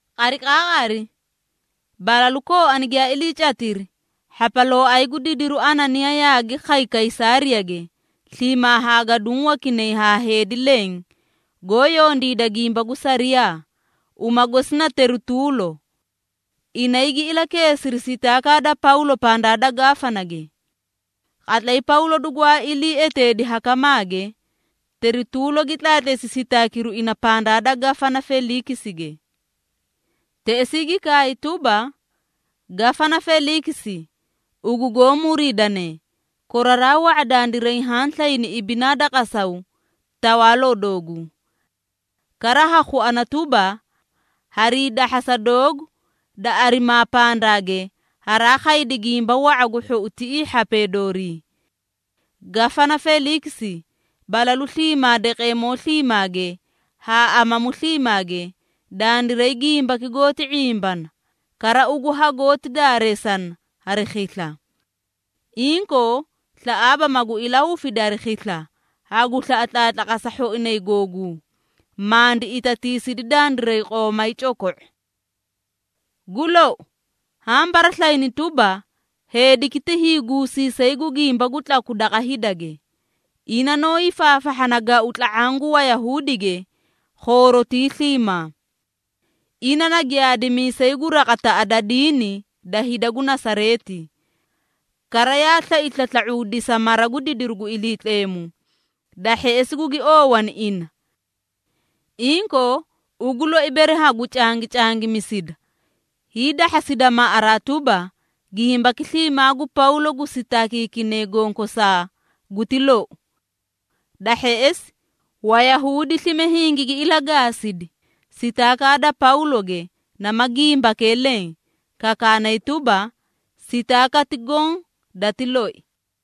Qariqaaqari balalu kooani giyaa iliicatiri, hhapalooay gu didiru Ananiyaa yaagi khay Kaysaariyage sliimaa haa gaduũ wakinay haa heedi leẽ goó yondiida gimba gu sariyaa, uma gosi na Terituulo. Inay gi ilakeesiri sitaakaa da Pawlo pandaa da Gafanage. Qatlay Pawlo dugwaa ilii eteedi hakamaage, Terituulo gi tlaatleesi sitaakiru ina pandaa da Gafana Feliikisige. Teꞌesii gi kaay tuba, “Gafana Feliikisi, ugu goó muriidane, koraraa wa⁄a dandiray haã slayni ibinaa da qasaw tawaaloo dooguu. Kara ha khuana tuba, harii dahhasa doogu da arimaa pandaage haraa khaydi gimba wa⁄a gu hhou tiꞌii hhapee doorii. Gafana Feliikisi, balalu sliimaa daqeemoo sliimaage haa amamu sliimaage dandiray gimbaki goóti ⁄imbana, kara ugu hagoóti daareesana hari khisla. Inkoo, slaꞌaaba magu ilahufidi hari khisla, hagu slaꞌa tlaatlaqasa hhoinay googuu, mandi itatiisidi dandiray qoomay coko⁄o. Gu lou, haã baraslayini tuba, heediki ti hiiguusiisay gu gimba gu tlaku daqa hidage, ina noó hiifaafahhana gau tla⁄aã gu Wayahuudige khoorotii sliimaa. Ina na giyaadimiisay gu raqataꞌa da diini da hida gu Nasareeti. Kara yaa slai slasla⁄uudisa mara gu didiru gu Iliitleemu, da hheꞌesi gugi oowani ina. Inkoo, ugu loi bere hagu cangicangimisida, hiidahhasida maꞌaraa tuba, gimbaki sliimaa gu Pawlo gu sitaakiikine gonkosaa guti lou.” Da hheꞌesi Wayahuudi slime hingigi ilagaasidi, sitaakaa da Pawloge nama gimbakee leẽ, kakaanay tuba, sitaakati goõ dati loi.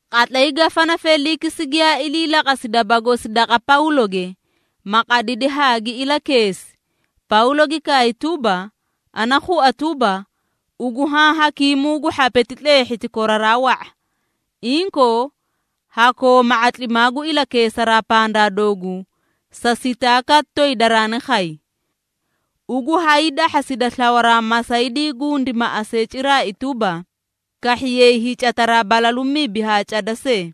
Qatlay Gafana Feliikisi giyaa iliilaqasi daba gosi daqa Pawloge, ma qadidi haa gi ilakeesi, Pawlo gi kaay tuba, “Ana khua tuba, ugu haã hakiimuu gu hhapeti tleehhiti koraraa wa⁄a. Inkoo, ha kooma ⁄atlimaa gu ilakeesaraa pandaa dooguu sa sitaakati toyi daraani khay. Ugu hayii dahhasida slawaraa masaydii gundi maꞌasee ciraai tuba, kahhiyay hiicataraa balalu mibi haa cada see,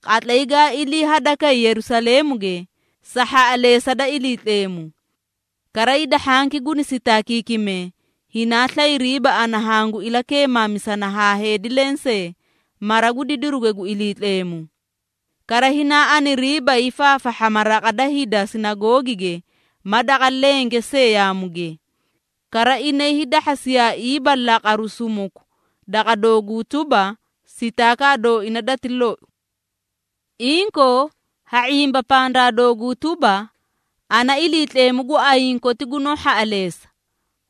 qatlay gaa ilii hadakay Yerusaleemuge sa hhaꞌaleesa da Iliitleemu. Kara hida hhanki guni sitaakiikimee, hinaa slayriiba ana hangu ilaki⁄imisana haa heedi lensee mara gu didiruge gu Iliitleemu. Kara hinaa aniriiba hiifaafahhama raqa da hida sinagoogige ma daqa lenge see yaamuge. Kara inay hiidahhasiyaaiiba laqaru sumuku daqa dooguu tuba, sitaakaa dooina dati lou. Inkoo, ha ⁄imba pandaa dooguu tuba, ana Iliitleemu gu ayiĩ koti gunoó hhaꞌaleesa,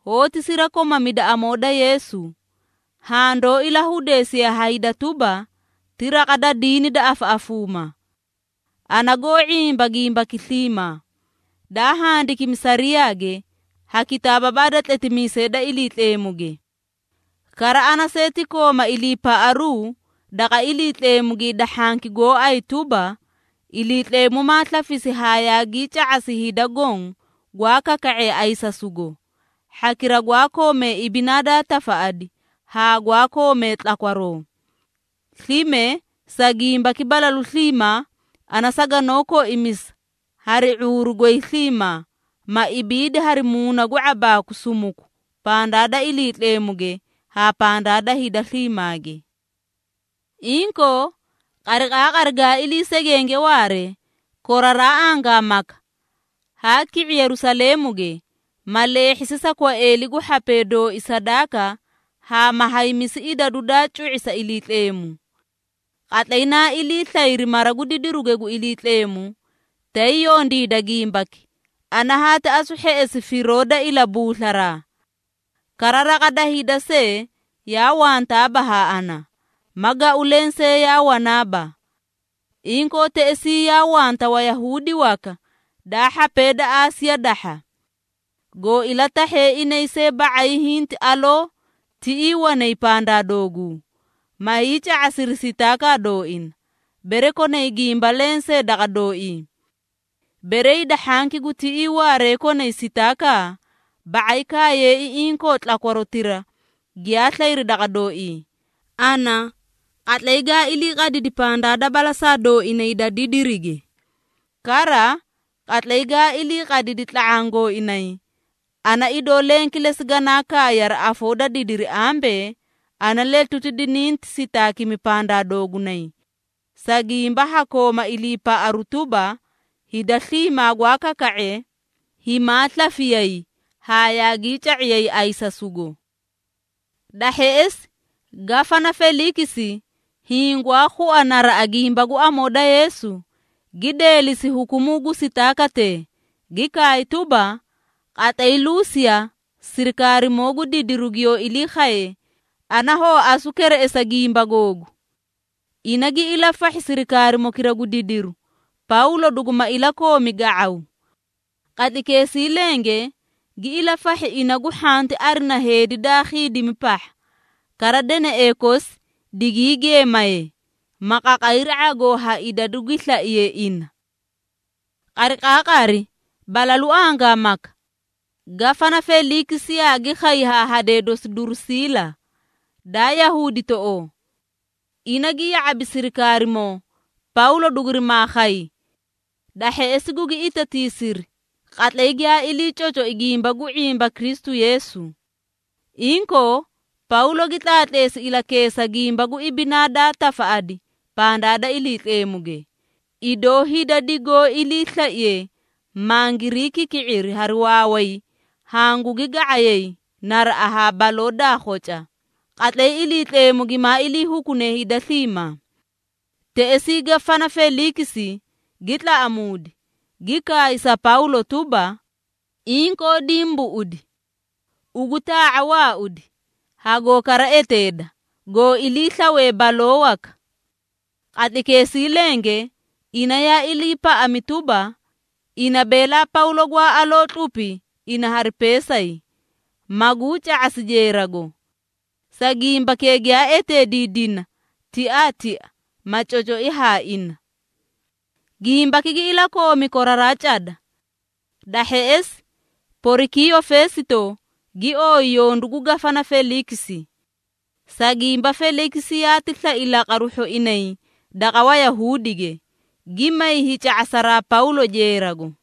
hoóti sirakomamida Amoo da Yeesu, haã doó ilahudeesiye ha hida tuba, ti raqa da diini da afaꞌafuuma. Ana goó ⁄imba gimbaki sliimaa, daa handikimi sariyaage ha kitaababaa da tletimiisee da Iliitleemuge. Kara ana see ti kooma iliipaꞌaru daqa Iliitleemuge hida hhanki gooay tuba, Iliitleemu maa slafisi haa yaagii ca⁄asi hida goõ gwaa kaka⁄ee ayisasugo, hhakira gwaa komee ibinaa daa tafaꞌadi haa gwaa koomee tlakwaroo. Slime sa gimbaki balalu sliimaa ana saganoó koimisa hari ⁄uuru goy sliimaa, ma ibiidi hari muuna gu ⁄abaaku sumuku pandaa da Iliitleemuge haa pandaa da hida sliimaage. Inkoo, qariqaaqari gaa ilii segenge waare koraraa angaamaka, haa ki⁄i Yerusaleemuge, ma leehhisi sa kwaeeli gu hhapee dooi sadaaka haa ma haymisi idadu daa cu⁄i sa Iliitleemu. Qatlay naa ilii slayri mara gu didiruge gu Iliitleemu, tay yondiida gimbaki, ana haati asu hheꞌesi firoo da ilabuuslaraa. Kara raqa da hida see yaa wantaaba haa ana, ma gau lensee yaa wanaaba. Inkoo, teꞌesii yaa wanta Wayahuudi waka, daa hhapee da Aasiya dahha. Goó ilatahhe inay see ba⁄ay hinti aloo tiꞌii wanay pandaa dooguu, ma hiica⁄asiri sitaakaa dooina, bere konay gimba lensee daqa dooii. Bere hida hhanki gu tiꞌii waaree konay sitaaka, ba⁄ay kaayee inkoo tlakwarotira giyaa slayri daqa dooii, ana qatlay gaa ilii qadidi pandaa da balasaa dooinay da didirige. Kara, qatlay gaa ilii qadidi tla⁄aã gooinay, ana idoo leẽ kilesi ganaa kaay hari afoo da didiri ambee, ‘Ana letuti dininti sitaakimi pandaa doogunay, sa gimba ha kooma iliipaꞌaru tuba, hida sliimaa gwaa kaka⁄ee, himaa slafiyay haa yaagii ca⁄iyay ayisasugo.’” Da hheꞌesi Gafana Feliikisi, hiĩ gwaa khua naraꞌa gimba gu Amoo da Yeesu, gi deelisi hukumuu gu sitaakatee, gi kaay tuba, “Qatlay Luusiya sirikaarimoo gu didiru giyoó ilii khaye, ana hoo asu kereꞌesa gimba googu.” Ina gi ilafahhi sirikaarimokira gu didiru, Pawlo duguma ilakoomi ga⁄aw. Qatlaykeesii lenge, gi ilafahhi ina gu hhanti arina heedi daa khiidimi pahha, kara deneꞌee kosi digii geemaye, ma qaqayri ⁄agoo ha idadu gi slaiye ina. Qariqaaqari balalu angaamaka, Gafana Feliikisi yaagi khay haa hadee dosi Durusiila, daa Yahuuditoꞌoo. Ina gi ya⁄abi sirikaarimoo, Pawlo dugurimaa khay. Da hheꞌesi gugi itatiisiri qatlay giyaa ilii cocoi gimba gu ⁄imba Kristu Yeesu. Inkoo, Pawlo gi tlaatleesi ilakeesa gimba gu ibinaa daa tafaꞌadi pandaa da Iliitleemuge, idoo hida digoó iliislaiye mangirii kiki⁄iri hari waaway hangugi ga⁄ayay naraꞌa haa baloo daa khoca, qatlay Iliitleemu gimaa ilii hukune hida sliimaa. Teꞌesii Gafana Feliikisi gi tlaꞌamuudi, gi kaay sa Pawlo tuba, “Inkoo dimbuꞌudi! Ugu taa⁄a waaudi, hagoo kara eteeda, goo ilii slawe baloo waka.” Qatlaykeesii lenge ina yaa iliipaꞌami tuba, ina beelaa Pawlo gwaa aloo tlupi ina hari peesay, maguu ca⁄asi jeerago. Sa gimbakee giyaa eteediidina tiaatia, ma cocoi haa ina. Gimbaki gi ilakoomi koraraa cada. Da hheꞌesi, Porikiiyo Feesito gii oyi yondu gu Gafana Feliikisi. Sa gimba Feliikisi yaati slai laqaru hhoinay daqa Wayahuudige, gi may hiica⁄asaraa Pawlo jeerago.